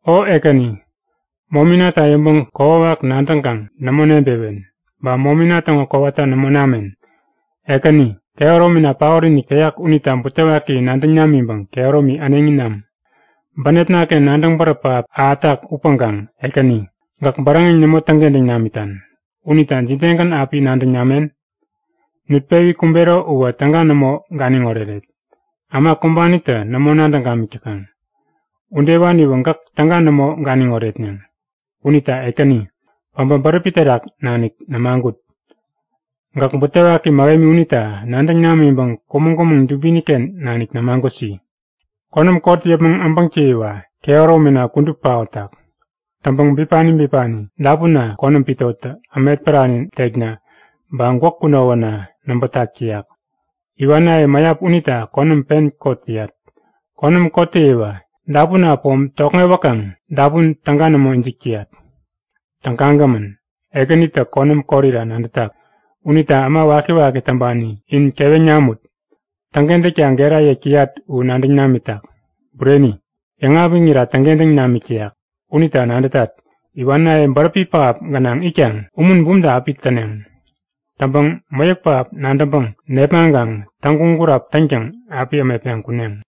O Ekäni, mominata yäŋpäŋ kokwawak nadäŋkaŋ nämo nebewen, ba momina täŋo kowata nämo namen. Ekäni, kehäromina paotinik täyak unita butewaki nadäŋ namiŋpäŋ kehäromi äneŋi nam. Bänepnaken nadäŋ bäräp pähap ahätak upäŋkaŋ Ekäni, gäk bäräŋeŋ nämo täŋkentäŋ namitan. Unita jidegän api nadäŋ namen? Nutpewi kumbero uwä täga nämo ganiŋ oreret. Äma kumbanitä nämo nadäŋ gamik täkaŋ. Udewaniwä gäk täga nämo ganiŋ oretneŋ. Unita Ekäni, päbä bäräpi terak nanik nämagut. Gäk butewaki mähemi unita nadäŋ namiŋpäŋ kumäŋ-kumäŋ dubiniken nanik nämagutsi. Konäm kot yäpmäŋ äbäŋtäyiwa kehäromina kudup paotak. Täŋpäŋ bipani bipani dapunna konäm pitotä ämetpärani tekna ba gwäk kunowäna näbätak täyak. Iwanaye mäyap unita konäm pen kot täyat. Konäm kottäyiwa dapunna pom tokŋewäkaŋ dapun täga nämo ijik täyat. Tägagämän! Ekänitä konäm korira nadätak. Unita äma wakiwaki täŋpani in keweŋ namut! Täŋkentäkta gera yäk täyat u nadäŋ namitak. Bureni, yäŋapiŋira täŋkentäŋ namik täyak. Unita nadätat; Iwanaye bäräpi pähap gänaŋ itkaŋ umun bumta api täneŋ. Täŋpäŋ mäyäk pähap nadäŋpäŋ nepmaŋkaŋ täŋguŋ-gurap täŋtäŋ api ämetpeŋ kuneŋ.